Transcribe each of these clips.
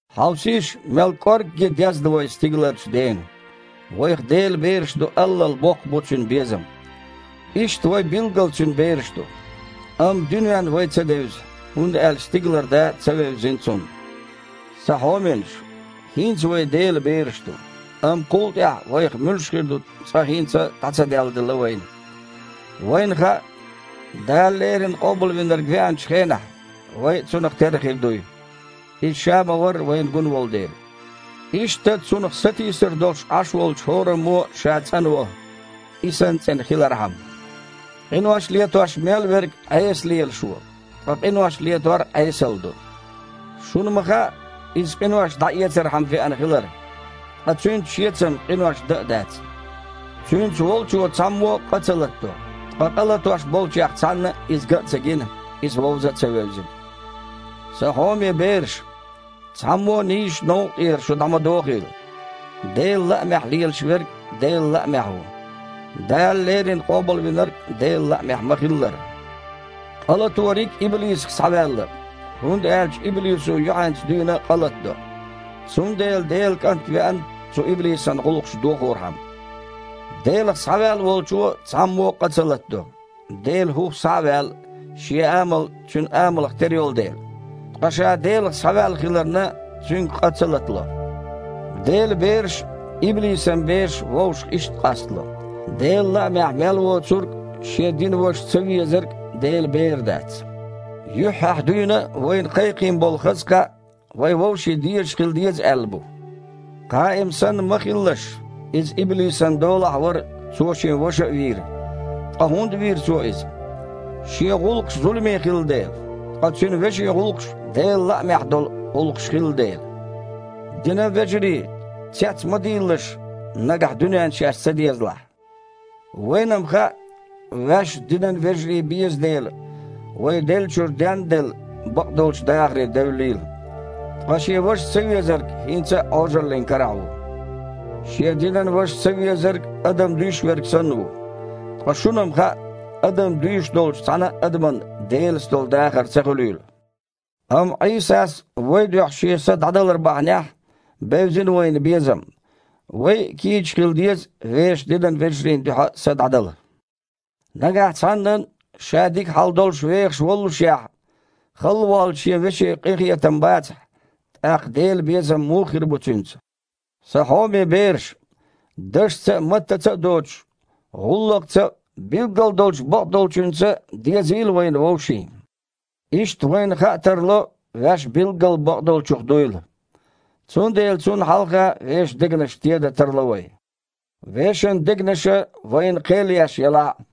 Хьовсийша, мел кІоргге дезна вай стигаларчу Дена. Вайх Делан бераш ду аллал боккха бу Цуьнан безам. Иштта, вай билггал Цуьнан бераш ду. Амма дуьненна вай ца девза, хІунда аьлча стигалара Да ца вевзина цунна. Сан хьоменаш! ХІинца вай Делан бераш ду, амма кхул тІаьхьа вайх муьлш хир ду цкъа хІинца а дІа ца делладелла вайна. Вайна хаьа, Дала леррина Къобалвинарг веанчу хенахь, вай а Цунах терра хир дуй, Иза Ша ма-варра вайна гун волу дела. Иштта Цунах сатийсар долуш Іаш волчу хІораммо а ша цІанво, И санна цІена хилархьама. Къинош летош мел верг Іеса лелаш ву, ткъа къинош летор Іесалла ду. Шуна ма хаьа, Иза къинош дІаэцархьама веана хилар. Ткъа Цуьнца шеца-м къинош дан а дац. Цуьнца волчо цхьаммо а къа ца латадо. Ткъа къа латош болчех цхьанна а Иза ган а ца гина, Иза вовза а ца вевзина. Сан хьоме бераш! Цхьаммо а нийсачу новкъа тІера шу дІа ма дохийла! Делан лаамехь лелаш верг – Делан лаамехь ву, Дала леррина Къобалвинарг а Делан лаамехь ма-хиллара. Къа латориг иблисах схьаваьлла, хІунда аьлча иблисо юьхьанца дуьйна а къа латадо. Цундела Делан КІант веана цу иблисан гІуллакхаш дохорхьама. Делах схьаваьлла волчо цхьаммо а къа ца латадо, Делан хІух схьа а ваьлла, шен амал Цуьнан амалх тера йолу дела. Ткъа ша Делах схьаваьлла хиларна, цуьнга къа ца латало. Делан бераш а, иблисан бераш а вовшах иштта къастало. Делан лаамехь мел воцург а, шен динан ваша цавезарг а Делан бер дац. Юьххьехь дуьйна а вайна кхайкхийна болу хаза кхаъ вай вовшийн дезаш хила деза аьлла бу. Кхаим санна ма хилалаш, иза иблисан долахь а вара, цо шен ваша а вийра. Ткъа хІунда вийра цо иза? Шен гІуллакхаш зуламе хилла дела, ткъа цуьнан вешин гІуллакхаш Делан лаамехь долу гІуллакхаш хилла дела. Динан вежарий, цец ма дийлалаш, нагахь дуьненна шаьш ца дезалахь. Вайна-м хаьа, ваьшна динан вежарий беза дела, вай, деллачуьра ден а делла, бакъдолчу дахаре девллийла. Ткъа шен ваша цавезарг хІинца а Іожаллин карахь ву. Шен динан ваша цавезарг адам дуьйш верг санна ву. Ткъа шуна-м хаьа, адам дуьйш долчу цхьана а адаман Делаца долу дахар ца хуьлийла. Амма Іийсас вайн дуьхьа Шен са дІадалар бахьанехь, бевзина вайна безам. Вай а кийча хила деза вешан динан вежарийн дуьхьа са дІадала. Нагахь цхьаннан, ша дика хьал долуш вехаш воллушехь, халла воллучу шен веше къинхетам бацахь, тІаккха Делан безам муха хир бу цуьнца? Сан хьоме бераш! Дашца а, маттаца а доцуш, гІуллакхца а, билггал долчу бакъдолчуьнца а дезийла вайна вовшийн. Иштта вайна хаа тарло, ваьш билггал бакъдолчух дуйла. Цундела Цунна хьалха вешан дегнаш тедан тарло вай, вешан дегнаша вайна кхел еш елахь а.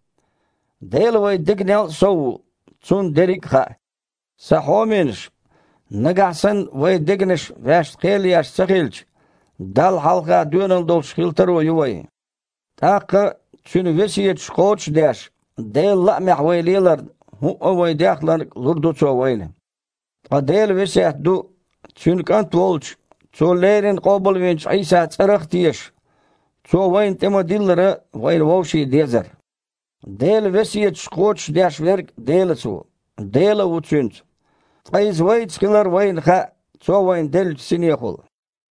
Дела вайн дегнел а сов ву, Цунна дерриг а хаьа. Сан хьоменаш! Нагахь санна вайн дегнаша ваьшна кхел еш ца хилча, Далла хьалха доьналла долуш хила таро ю вайн. ТІаккха, Цуьнан весеташ кхочуш а деш, Делан лаамехь вай леларна, хІуъа а вай дехнарг лур ду Цо вайна. Ткъа Делан весет ду: Цуьнан КІант волчу, Цо леррина къобалвинчу Іийсан цІарах а тешаш, Цо вайна тІе-ма-диллара, вайна вовшийн дезар. Делан весеташ кхочушдеш верг Делаца ву, Дела а ву цуьнца. Ткъа Иза вайца хилар вайна хаьа, Цо вайна деллачу Синехула.